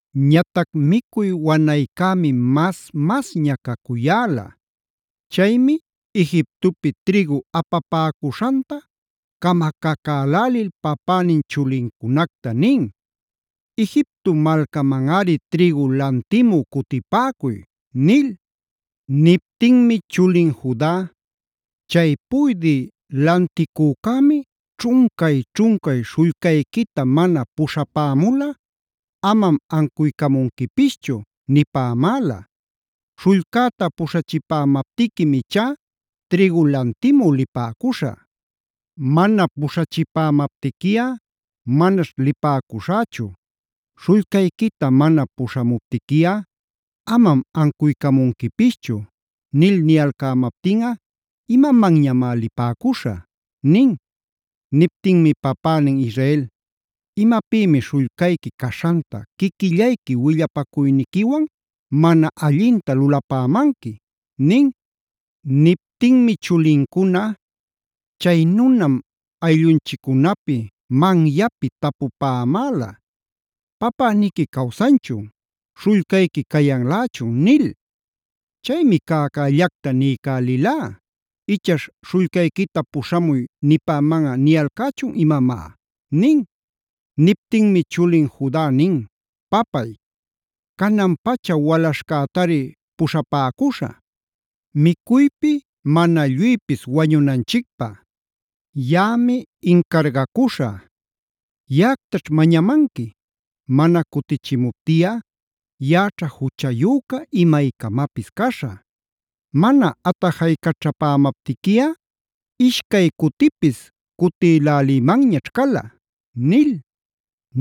Ñatac micuy wanaycämi mas-masña cacuyäla. Chaymi Egiptopi trïgu apapäcuśhanta camacacälälil papänin chulincunacta nin: “Egipto malcamanꞌari trïgu lantimü cutipäcuy” nil. Niptinmi chulin Juda: “Chay puydï lanticücämi ćhuncay-ćhuncay ‘śhullcayquita mana puśhapämulꞌa amam ancuycamunquipischu’ nipämäla. Śhullcäta puśhachipämaptiquim ichá trïgu lantimü lipäcuśhä. Mana puśhachipämaptiquiꞌa manaćh lipäcuśhächu, ‘śhullcayquita mana puśhamuptiquiꞌa amam ancuycamunquipischu’ nil niyalcämaptinꞌa ¡imamanñamá lipäcuśhä!” nin. Niptinmi papänin Israel: “¿Imapïmi śhullcayqui caśhanta quiquillayqui willapacuyniquiwan, mana allinta lulapämanqui?” nin. Niptinmi chulincuna: “Chay nunam ayllunchiccunapi manyapi tapupämäla ‘¿Papäniqui cawsanchun? ¿śhullcayqui cayanlächun?’ nil. Chaymi cäcällacta niycälilá, ichaśh śhullcayquita puśhamuy nipämanꞌa niyalcächun imamá” nin. Niptinmi chulin Juda nin: “Papay, canan-pacha walaśhcätari puśhapäcuśha, micuypi mana lluypis wañunanchicpä. Yaꞌami incargacuśha, yaꞌactaćh mañamanqui. Mana cutichimuptiꞌa yaꞌaćha juchayüca imaycamapis caśhä. Mana atajaycaćhapämaptiquiꞌa ishcay cutipis cutïlälïmanñaćh cala” nil.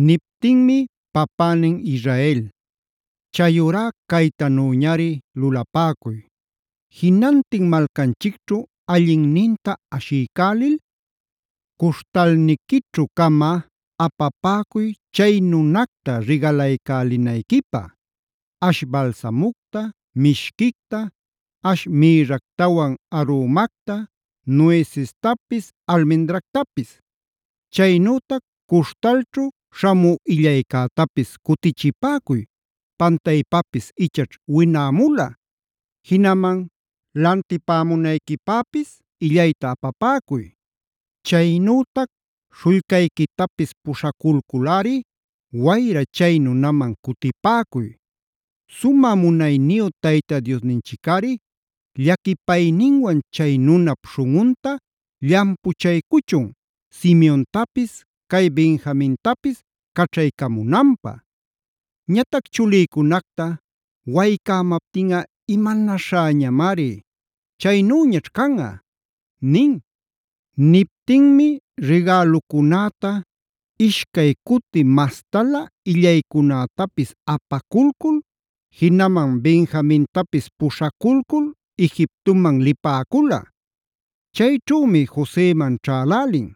Niptinmi papänin Israel: “Chayurá caytanüñari lulapäcuy: Jinantin malcanchicćhu allinninta ashiycälil cuśhtalniquićhu-cama apapäcuy chay nunacta rigalaycälinayquipä: ash balsamucta, mishquicta, ash mïrractawan arumacta, nuecestapis, almendractapis. Chaynütac cuśhtalćhu śhamü illaycätapis cutichipäcuy, pantaypapis ichaćh winämula. Jinaman lantipämunayquipäpis illayta apapäcuy. Chaynütac śhullcayquitapis puśhaculculꞌari, wayra chay nunaman cutipäcuy. Sumä munayniyu Tayta Diosninchicꞌari llaquipayninwan chay nunap śhunꞌunta llampuchaycuchun Simeontapis, cay Benjamintapis caćhaycamunanpä. Ñatac chulïcunacta waycämaptinꞌa ¡imanaśhäñamari! ¡Chaynüñaćh canꞌa!” nin. Niptinmi rigälucunäta, ishcay cuti mastalä illaycunätapis apaculcul, jinaman Benjamintapis puśhaculcul Egiptoman lipäcula. Chayćhümi Joseman ćhälälin.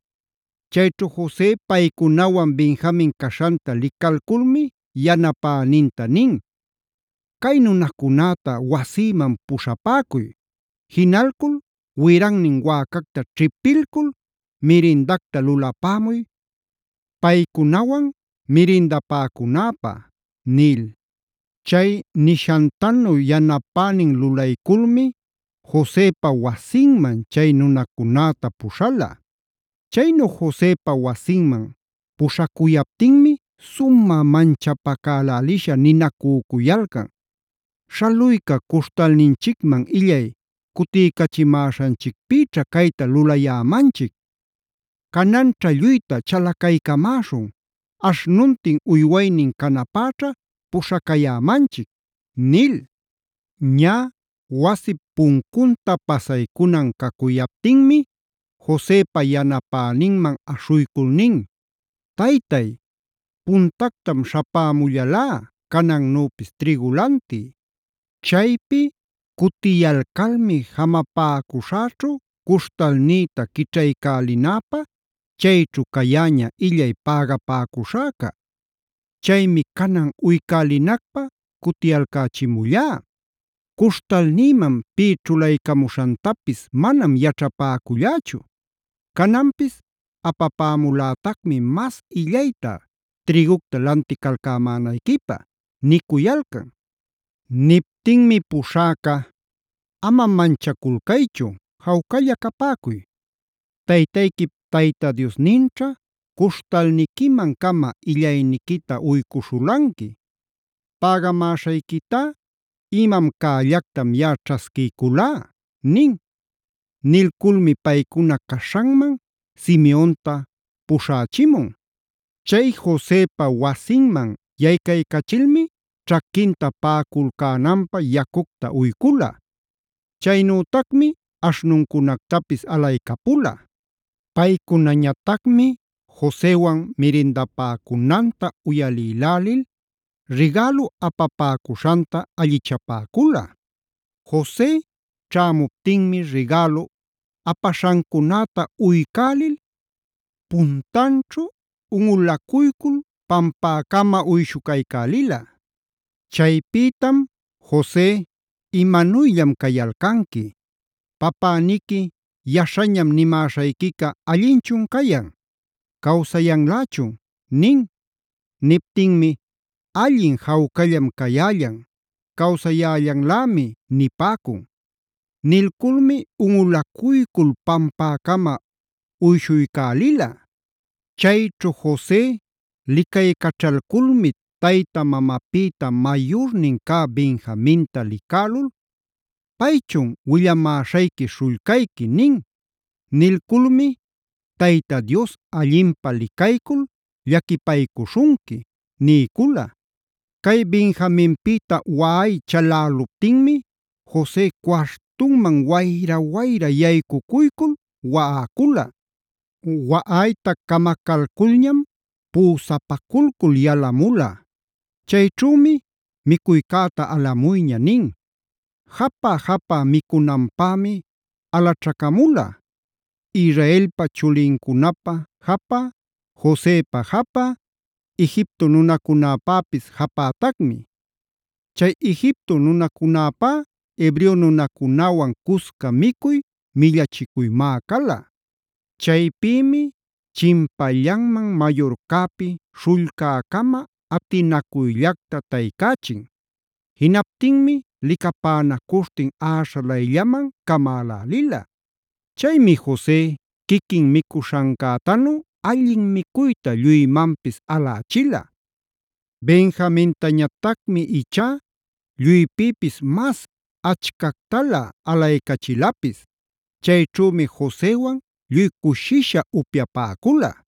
Chayćhu Jose paycunawan Benjamin caśhanta licalculmi yanapäninta nin: “Cay nunacunäta wasïman puśhapäcuy. Jinalcul wirannin wäcacta ćhipilcul mirindacta lulapämuy paycunawan mirindapäcunäpä” nil. Chay nishantanu yanapänin lulayculmi Josepa wasinman chay nunacunäta puśhala. Chaynu Josepa wasinman puśhacuyaptinmi sumä manchapacälälisha ninacücuyalcan: “Śhaluyca cuśhtalninchicman illay cutiycachimäśhanchicpïćha cayta lulayämanchic. Cananćha lluyta chalacaycamäśhun, aśhnuntin uywaynin canapäćha puśhacayämanchic” nil. Ñä wasip puncunta pasaycunan cacuyaptinmi Josepa yanapäninman aśhuycul nin: “Taytay, puntactam śhapämullalá canannüpis trïgu lantï. Chaypi cutiyalcalmi jamapäcuśhäćhu cuśhtalnïta quićhaycälinäpä chayćhu cayäña illay pägapäcuśhäca. Chaymi canan uycälinacpä cutiyalcächimullá. ¡Cuśhtalnïman pï ćhulaycamuśhantapis manam yaćhapäcullächu! Cananpis apapämulätacmi mas illayta trïgucta lanticalcämänayquipä” nicuyalcan. Niptinmi puśhäca: “Ama manchaculcaychu jawcalla capäcuy. Taytayquip Tayta Diosninćha cuśhtalniquiman-cama illayniquita uycuśhulanqui. Pägamäśhayquitá imam cällactam yaꞌa ćhasquiyculá” nin. Nilculmi paycuna caśhanman Simeonta puśhächimun. Chay Josepa wasinman yaycaycachilmi ćhaquinta paꞌaculcänanpä yacucta uycula. Chaynütacmi aśhnuncunactapis alaycapula. Paycunañatacmi Josewan mirindapäcunanta uyalïlälil rigälu apapäcuśhanta allichapäcula. Jose ćhämuptinmi rigälu apaśhancunäta uycälil puntanćhu unꞌulacuycul pampäcama uyshucaycälila. Chaypïtam Jose: “¿Imanuyllam cayalcanqui? Papäniqui, yaśhañam nimäśhayquica ¿allinchun cayan? ¿Cawsayanlächun?” nin. Niptinmi: “Allin jawcallam cayällan, cawsayällanlämi” nipäcun. Nilculmi unꞌulacuycul pampäcama uyshuycälila. Chayćhu Jose licaycaćhalculmi tayta mamapïta mayurnin cä Benjaminta licälul: “¿Paychun willamäśhayqui śhullcayqui?” nin. Nilculmi: “Tayta Dios allinpä licaycul llaquipaycuśhunqui” niycula. Cay Benjaminpïta waꞌay chaläluptinmi Jose cuartunman wayra-wayra yaycucuycul waꞌacula. Waꞌayta camacalculñam püsapaculcul yalamula. Chayćhümi: “Micuycäta alamuyña” nin. Japä-japä micunanpämi alaćhacamula: Israelpa chulincunapä japä, Josepa japä, Egipto nunacunäpäpis japätacmi. Chay Egipto nunacunäpá Hebreo nunacunäwan cusca micuy millachicuymá cala. Chaypïmi chinpallanman mayurcäpi śhullcäcama atinacuyllacta taycächin. Jinaptinmi licapänacuśhtin äśhalayllaman camälälila. Chaymi Jose quiquin micuśhancätanu allin micuyta lluymanpis alächila. Benjamintañatacmi ichá lluypïpis mas achcactalä alaycachilapis. Chayćhümi Josewan lluy cushisha upyapäcula.